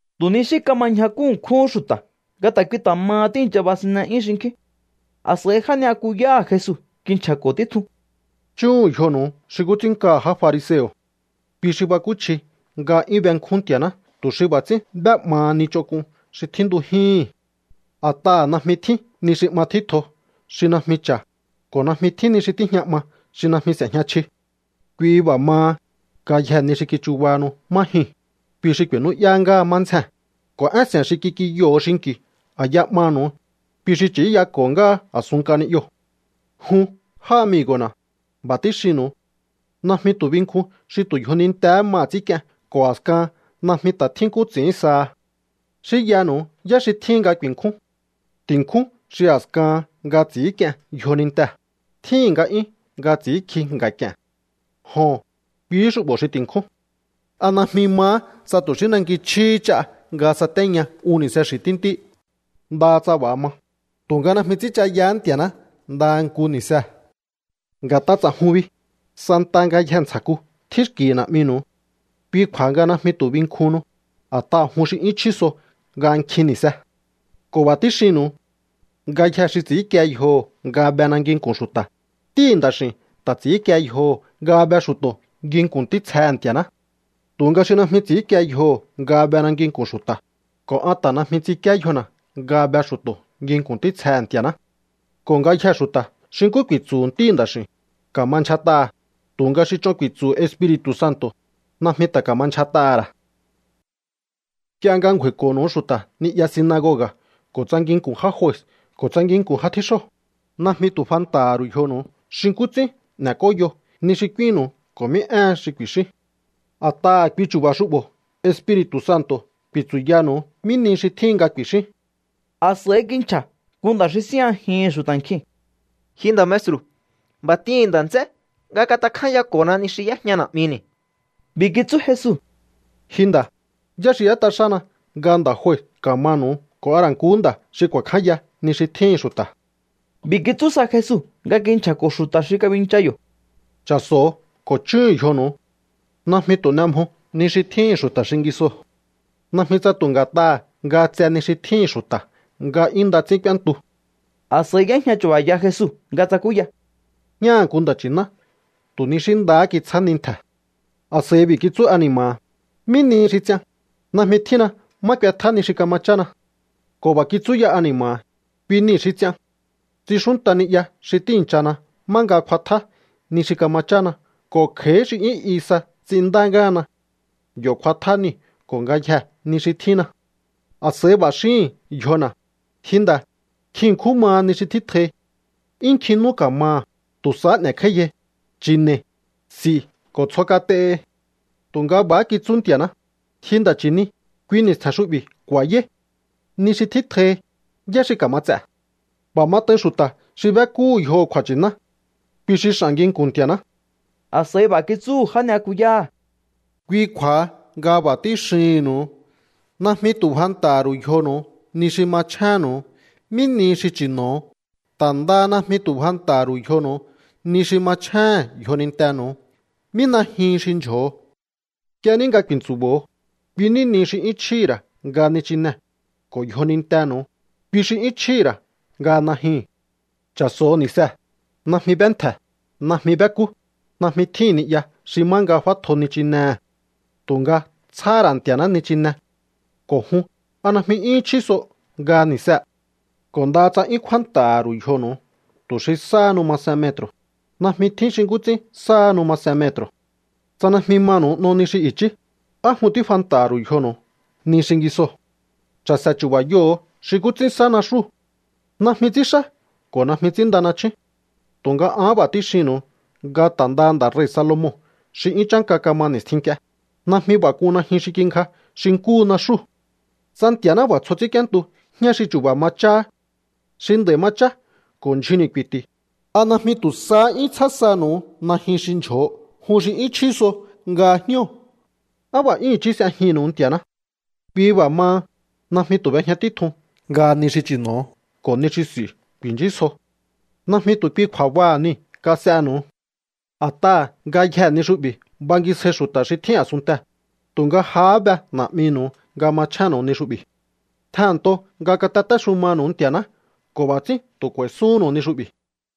Tu̱ ni xí kama ñjakú ṉkjúhún xu̱ta̱ nga ta̱ kui ta̱ maha tíi̱ncha basinne'yún xinkjín. A̱s'a̱i já ni'yakuyáha̱ Jesu kinchja̱ko̱ títjun: —Chúhu̱un yjonu̱u xi nkú ts'ín nkaha̱ já fariseo̱. Kui xi bakúchji nga 'yún benkjún Nti̱a̱ná tu̱ xi b'a̱ ts'ín b'é'maha ni ch'onk'un xi tjíntujíhi̱n. A̱t'aha̱ najmi tjín ni xi 'ma tjítjo xi najmi cha̱, ko̱ najmi tjín ni xi tíjña 'ma xi najmi s'e̱jña chji. Kui b'a̱ maha, ngayjee̱ ni xi kichubahanu má jyuu̱n, kui xi ku̱i̱nú'yá ngáha má ndzjee̱n. Ko̱ én se̱n xi kik'inyoho̱o xinki̱u a̱ya 'manu̱u, kui xi ch'i̱íyako̱ ngáha a̱sun nk'a ni'yoo̱. ’Jun, já amigo̱na̱, b'a̱ tíxinnu̱u. Najmi tu̱ binkjun xi tu̱ yjonintee̱hé maha̱ ts'ínk'ien ko̱ a̱skahan najmi ta̱ tjín nkú ts'i̱ín saha. Xínyanu̱u yá xi tjíhin nga ku̱i̱nkjún. Ti̱nkjún xi a̱skahan nga ts'i̱ínk'ien yjonintee̱, tjíhi̱n nga'yún nga ts'i̱ínkji nga̱k'i̱e̱n. Joho̱n, kuihí xu'bo̱ xi ti̱nkjún. ¿A najmi mahá tsa tu̱ xí nanki chjíhí ch'a nga satéña un ni̱se xi̱ tíntí? Ndaha tsa b'a̱ ma, tu̱nga najmi ts'ínchayahá Nti̱a̱ná ndaha nku ni̱see̱. Nga̱t'a ts'a̱jun bi, santaha ngayjee̱ ntsja̱ku tjín xki̱hi̱ Na̱'minu̱u. Kui kju̱a̱ha nga najmi tu̱ binkjuhunnu, a̱t'aha̱ jun xi 'yún chjí so nga nkjin ni̱se. ’Ko̱ b'a̱ tíxinnu̱u. Ngayjee̱ xi ts'i̱ínkie yjoho̱ nga bena nginku̱n xu̱ta̱, Ntíhi̱ Nda̱x'i̱u̱n ta̱ ts'i̱ínkie yjoho̱ nga be xu̱to̱ nginku̱n ntítsjehe̱ Nti̱a̱ná. Tu̱nga xi najmi ts'i̱ínkie yjoho̱ nga bena nginku̱n xu̱ta̱, ko̱ an ta̱ najmi ts'inkíé yjona̱ nga be xu̱to̱ nginku̱n ntítsjehe̱ Nti̱a̱ná. Ko̱ ngayjee̱ xu̱ta̱ xi nkú ku̱i̱tsu̱hu̱ Ntíhi̱ Nda̱x'i̱u̱n, ka̱ma ndyjat'aha̱. Tu̱nga xi ch'on ku̱i̱tsu̱hu̱ Espiri̱tu̱ Santo̱, najmi ta̱ ka̱ma ndyjat'aha̱ ra̱. Nk'ie nga ngju̱a̱i̱ko̱nu̱u xu̱ta̱ ni'ya sinagoga̱ ko̱ tsa nginku̱n já jue ko̱ tsa nginku̱n já tjíxóo̱, najmi tu̱ fanta̱ha̱ ru̱u yjonu̱u xi nkú ts'ín n'ek'óyo ni xi k'úínnu̱u ko̱ mí éhen xi ku̱i̱xíún. A̱t'aha̱ kui chu̱ba̱ xu'bo̱ Espiri̱tu̱ Santo̱ ku̱i̱tsu̱yanu̱u mí ni xi tjíhin nga ku̱i̱xíún. A̱s'a̱i kinchja̱ nku nda̱ xi síjñajihi̱n xu̱ta̱ nkjiu̱n: —Ji nda̱ maestru̱, b'a̱ t'ihi̱n nda̱ nts'é nga katakjányako̱na ni xi y'éjña na̱'mini̱. B'i̱ kitsú Jesu: —Ji nda̱, ¿yá xi y'ét'a xána nga nda̱ jue ka̱manu̱u ko̱ a ra̱ nku nda̱ xi ku̱a̱kjánya ni xi tjíhi̱n xu̱ta̱? B'i̱ kitsú sa Jesu nga kinchja̱ko̱ xu̱ta̱ xi kabincha yo̱: —Cha̱so̱o ko̱ chúhu̱un yjonu̱u. Najmi tu̱ n'e mjo ni xi tjíhi̱n xu̱ta̱ xingisoo̱. Najmi tsa tu̱ nga̱t'aha̱ nga tse ni xi tjíhi̱n xu̱ta̱ nga 'yún nda ts'ín k'úéntu. A̱s'a̱i y'éjña chu̱ba̱ya Jesu nga tsakúya: —Jñáha̱ nku nda̱ nchi̱ná tu̱ ni xí ndahá kitsjá nintje̱. A̱s'a̱i b'i̱ kitsú ani̱ma̱ha̱: “¿Mí nihi xi ts'ian? Najmi tjínna má k'uetjá ni xi kama chána.” Ko̱ b'a̱ kitsú ya ani̱ma̱ha̱: “Kui nii̱ xi ts'ian. Ts'inxúnta ni'ya xi tíi̱nchana má nga f'atjá ni xi kama chána ko̱ kj'a̱í xi 'yún i sa ts'inndá ngáhana. Yo̱ kj'uatjá niu̱ ko̱ ngayjee̱ ni xi tjínna. A̱s'a̱i b'a̱ xíhi̱n yjona̱: Ji nda̱, nkjin ṉkjún maha ni xi tjítjohi. 'Yún nkjin nú ka̱maha̱. Tu̱ sahá n'e̱kj'áíyai, chi̱ne̱i, s'i̱ ko̱ tsjo kat'ehi.” Tu̱nga b'a̱há kitsú Nti̱a̱ná: “Ji nda̱ chi̱ni, kui ni̱stje̱n xu'bi̱ ku̱a̱yáí. Ni xi tjítjohi, ¿yá xi ka̱ma ts'e̱?” ’B'a̱ mat'ain xu̱ta̱ xi b'ékúhu̱ yjoho̱ kju̱a̱nchi̱ná. Kui xi x'a̱n nginku̱n Nti̱a̱ná. A̱s'a̱i b'a̱ kitsúhu̱ já ni'yakuyáha̱: —Kui kju̱a̱ha nga b'a̱ tíxihi̱nnu̱u. Najmi tu̱ fanta̱ha̱ ru̱u yjonu̱u ni xi machjénnu̱u, mí nihi xi chi̱no̱o. Ta̱ ndaha najmi tu̱ fanta̱ha̱ ru̱u yjonu̱u ni xi machjéhe̱n yjonintenu̱u, mí najyuhun xi ndyjo̱o. Nk'ie ní nga ku̱i̱ntsu̱bo̱o, kui ní nihi xi 'yún chjíhi̱ ra̱ nga nichinee̱, ko̱ yjonintenu̱u, kui xi 'yún chjíhi̱ ra̱ nga najyuu̱n. Cha̱so̱ho̱ ni̱see̱. Najmi b'éntje̱, najmi b'ékú, najmi tjíhi̱n ni'ya xi má nga f'átjo nichinehe̱. Tu̱nga tsjáhá ra̱ Nti̱a̱ná nichine. Ko̱ jun, ¿a najmi 'yúhún chjí so nga ni̱see̱? Ko̱ ndaha tsa 'yún kjúánta̱ha̱ ru̱u yjonu̱u tu̱ xi sáhanu masen metru̱, najmi tjín xi nkú ts'ín sáhanu masen metru̱. Tsa najmi manu̱u n'o ni xi i̱chí, ¿á jun tífanta̱ha̱ ru̱u yjonu̱u ni xingisoo̱? ’Cha̱se̱ chu̱ba̱yoho̱o xi nkú ts'ín sá naxúu̱. Najmi ts'ínxá ko̱ najmi ts'ínnda nachjún. Tu̱nga an b'a̱ tíxinnu̱u nga ta̱ ndaha nda̱ rei̱ Salomon xi 'yún chánka kama ni̱stjin nk'ie, najmi b'a̱ k'un najyun xi kingja xi nkúhu naxúu̱. Tsa Nti̱a̱ná b'a̱ tsjo ts'ínk'íéntu jñá xi chu̱ba̱ ma cháhá, xi nd'a̱i̱ ma chá ko̱ ndyjunni̱ ku̱i̱ti̱, ¿a najmi tu̱ sahá 'yún tsjá sanu̱u najyun xi ndyjo̱o jun xi 'yún chjí so nga jñóo̱? ¡Á b'a̱ 'yún i̱chí s'ejihi̱nnu̱u Nti̱a̱ná! Kui b'a̱ maha, najmi tu̱ b'ejña títjun nga ni xi chi̱no̱o ko̱ ni xi s'i̱u ku̱i̱nchísjo. Najmi tu̱ kui kju̱a̱baha̱ niu̱ kas'enu̱u. A̱t'aha̱ ngayjee̱ ni xu'bi̱ bangisjai xu̱ta̱ xi tjín a̱sunntee̱, tu̱nga jahá be Na̱'minu̱u nga machjénnu̱u ni xu'bi̱. Tjehe̱nnto nga katatéxumanu̱u Nti̱a̱ná ko̱ b'a̱ ts'ín tu̱ k'u̱a̱i̱suhúnnu̱u ni xu'bi̱.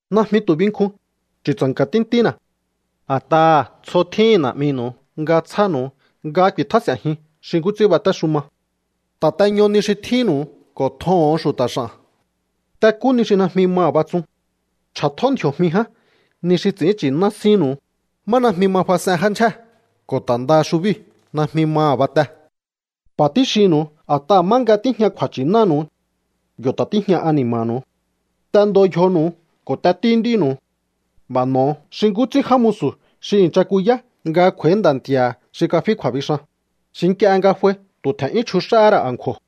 ’Najmi tu̱ binkjun, chu̱tsa̱nka̱ tíntína̱. A̱t'aha̱ tsjo tjíhi̱n Na̱'minu̱u nga tsjánu̱u nga ku̱i̱tjás'e̱njiun xi nkú ts'ín batéxuma. Ta̱teño ni xi tjínnu̱u ko̱ tjoho̱on xu̱ta̱ x'a̱n. T'ekú ni xi najmi maha̱ batsun. Ch'a̱tjó ndji̱o̱jmi ján ni xi ts'i̱ín nchi̱ná sínnu̱u, má najmi ma fas'en já ndyjé ko̱ ta̱ ndaha xubíu̱ najmi maha̱ bate. B'a̱ tíxinnu̱u a̱t'aha̱ má nga tíjña kju̱a̱nchi̱nánu̱u, yo̱ ta̱ tíjña ani̱ma̱nu̱u. ’T'endo yjonu̱u ko̱ t'etíú nd'ínu̱u. B'a̱ n'o̱o xi nkú ts'ín já musu̱ xi i̱ncha kuyá nga kj'u̱a̱í nda̱ nti̱a̱ha̱ xi kafí kju̱a̱bixan, xi nk'ie nga f'ai tu̱ tje̱n'yún chjux'áhá ra̱ a̱nkju̱o̱.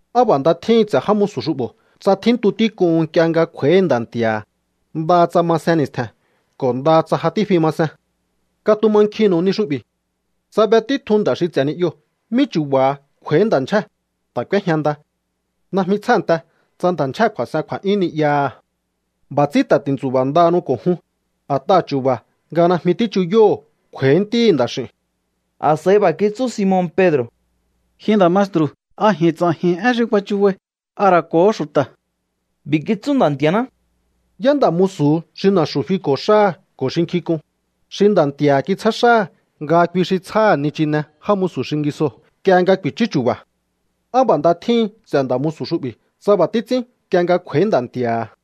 Á b'a̱ nda tjíhin ts'e̱ já musu̱ xu'bo̱ tsa tjíntu tík'un nk'ie nga kj'u̱a̱í nda̱ nti̱a̱ha̱, ndaha tsa masen ni̱stje̱n ko̱ ndaha tsa ja tífi ma sen. ’Katumankjinnu̱u ni xu'bi̱. Tsa be títjun nda̱ xi ts'e̱ ni'yoo̱ mí chu̱ba̱ha kj'u̱a̱í nda̱ ndyjée̱, ta̱ k'úéjña nda. Najmi tsjánte tsa nda̱ ndyjée̱ kju̱a̱s'en kju̱a̱'yún ni'yaha̱. B'a̱ ts'ín ta̱ ti̱ntsu̱ba̱ ndahanu ko̱ jun, a̱t'aha̱ chu̱ba̱ nga najmi tíchuyóho̱o kj'u̱a̱í Ntíhi̱ Nda̱x'i̱u̱n. A̱s'a̱i b'a̱ kitsú Simon Pedro̱: —Ji nda̱ maestru̱, ¿a ji̱n ts'a̱ji̱n én xi kuachubai, a ra̱ ko̱hó xu̱ta̱? B'i̱ kitsú Nda̱ Nti̱a̱ná: —¿Yá nda̱ musu̱hu xi na̱xu̱ fiko̱ xáha̱ ko̱ xi nkjink'un, xi nda̱ nti̱a̱ha̱ kitsjá xáha̱ nga kui xi tsjáha̱ nichine já musu̱ xingisoo̱ nk'ie nga ku̱i̱chú chu̱ba̱? ¡Á b'a̱ nda tjíhin ts'e̱ nda̱ musu̱ xu'bi̱ tsa b'a̱ títs'ín nk'ie nga kj'u̱a̱í nda̱ nti̱a̱ha̱!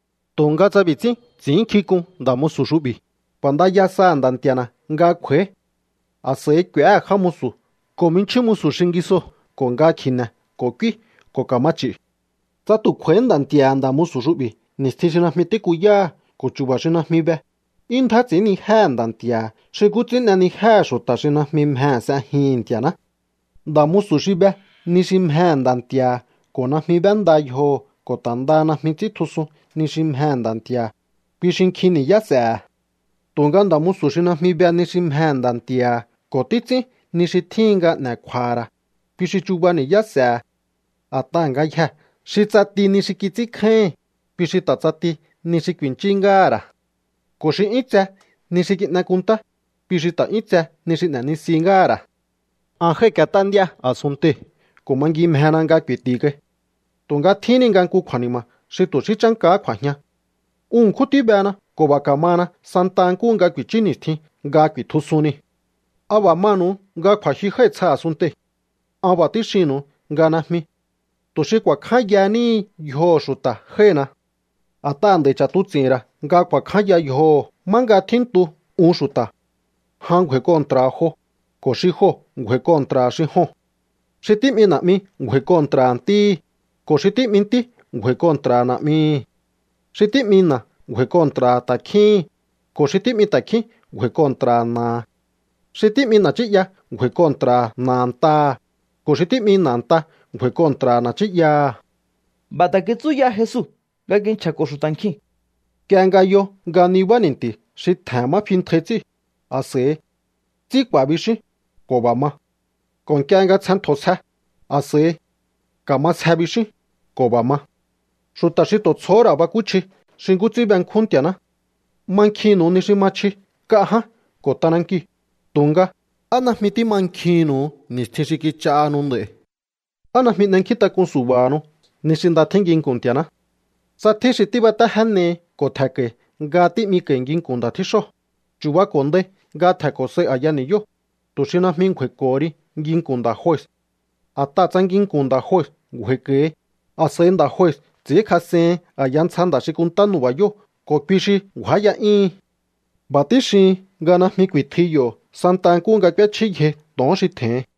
Tu̱nga tsa b'i̱ ts'ín ts'i̱ínnkjink'un nda̱ musu̱ xu'bi̱: “K'u̱a̱ndaya saha̱ nda̱ nti̱a̱na̱ nga kj'u̱a̱í.” A̱s'a̱i k'u̱éhe̱ já musu̱ ko̱ jminchjín musu̱ xingisoo̱ ko̱ nga kji̱ne̱ ko̱ k'úí ko̱ ka̱ma ch'i̱. Tsa tu̱ kj'u̱a̱íhí nda̱ nti̱a̱ha̱ nda̱ musu̱ xu'bi̱ ni̱stjin xi najmi tíkuyáha̱ ko̱ chu̱ba̱ xi najmi be, 'yún ndjá ts'i̱ínnijéhe̱ nda̱ nti̱a̱ha̱ xi nkú ts'ín n'enijéhe̱ xu̱ta̱ xi najmi mjehe̱ s'ejihi̱n Nti̱a̱ná. ’Nda̱ musu̱ xi be ni xi mjehe̱ nda̱ nti̱a̱ha̱ ko̱ najmi b'énda yjoho̱ ko̱ ta̱ ndaha najmi ts'íntjusun ni xi mjehe̱ nda̱ nti̱a̱ha̱, kui xi nkjin ni̱yá s'e̱he̱. Tu̱nga nda̱ musu̱ xi najmi be ni xi mjehe̱ nda̱ nti̱a̱ha̱ ko̱ títs'ín ni xi tjíhin nga n'e̱ kju̱a̱ha̱ ra̱, kui xi chuba ni̱yá s'e̱he̱. A̱t'aha̱ ngayjee̱ xi ts'ati ni xi kits'ínkjáíhi̱n, kui xi ta̱ ts'ati ni xi ku̱i̱nchí ngáha̱ ra̱. Ko̱ xi 'yún tse ni xi kin'e kunntá, kui xi ta̱ 'yún tse ni xi n'e̱nisi ngáha̱ ra̱. ’An jái̱k'iet'á nd'íá a̱sunntei̱ ko̱ mangimjena nga ku̱i̱ti̱ kai. Tu̱nga tjíhin ni nga nku kju̱a̱ni̱ma̱ xi tu̱ xí chánkahá kj'u̱a̱jian. Un ṉkjún tíbena ko̱ b'a̱ ka̱mana santaha nkúhu nga ku̱i̱chú ni̱stjin nga ku̱i̱tjusun niu̱. ¿A b'a̱ manu̱u nga kju̱a̱jyu jái̱ tsja a̱sunntei̱? An b'a̱ tíxinnu̱u nga najmi. Tu̱ xi kju̱a̱kjánya níhi yjoho̱ xu̱ta̱ jái̱hina. A̱t'aha̱ nd'a̱i̱ ch'a̱tuts'i̱hi̱n ra̱ nga ku̱a̱kjánya yjoho̱ má nga tjíntu un xu̱ta̱. Jan ngju̱a̱i̱ kontra̱ha̱ jo, ko̱ xi joo̱ ngju̱a̱i̱ kontra̱ha̱ xi joo̱n. Xi tí'mi na̱'mi ngju̱a̱i̱ kontra̱ha̱ ntíhi̱, ko̱ xi tí'mi ntí ngju̱a̱i̱ kontra̱ha̱ na̱'mihi̱. Xi tí'mi na̱a ngju̱a̱i̱ kontra̱ha̱ ta̱kjíhi̱n, ko̱ xi tí'mi ta̱kjín ngju̱a̱i̱ kontra̱ha̱ na̱aha̱. Xi tí'mi na̱ nchí'ya ngju̱a̱i̱ kontra̱ha̱ na̱ a̱ntaha̱, ko̱ xi tí'mi na̱ a̱nta ngju̱a̱i̱ kontra̱ha̱ na̱ nchí'yaha̱. B'a̱ ta̱ kitsú ya Jesu nga kinchja̱ko̱ xu̱ta̱ nkjiu̱n: —Nk'ie nga yo nga nibá ni̱nti̱ xi tje̱hen má fintjai ts'íu̱, a̱s'a̱i: “Tsí k'u̱a̱” bixíún, ko̱ b'a̱ ma. Ko̱ nk'ie nga tsjen ntjo̱ sje, a̱s'a̱i: “Ka̱ma sje” bixíún, ko̱ b'a̱ ma. ¡Xu̱ta̱ xi tu̱ tsjohó ra̱ bakúchji xi nkú ts'ín benkjún Nti̱a̱ná! Mankjinnu̱u ni xi ma chji nk'a ján ko̱ t'anankiu̱, tu̱nga, ¿á najmi tímankjihi̱nnu̱u ni̱stjin xi kich'ahanu nd'a̱i̱? ’¿Á najmi n'enkjíntak'un su̱ba̱hanu ni xi nda tjín nginku̱n Nti̱a̱ná? Tsa tjín xi tíbatéjénehi ko̱ tje̱nko̱i̱ nga tí'miko̱i̱ nginku̱n nda̱ tjíxóo̱, chu̱bako̱ndai nga tje̱nko̱ sai a̱ya ni̱yóo̱, tu̱ xi najmi ngju̱a̱i̱ko̱ho ri nginku̱n nda̱ jue. A̱t'aha̱ tsa nginku̱n nda̱ jue ngju̱a̱i̱ko̱hi, a̱s'a̱i nda̱ jue ts'i̱ínkjas'ehin a̱ya ntsja nda̱ xi kunntá nu̱ba̱yóo̱ ko̱ kui xi ngju̱áya'yíhin. B'a̱ tíxihin nga najmi ku̱i̱tjui yo̱ santa nkúhu nga k'úéchjíyjei to̱on xi tje̱hin.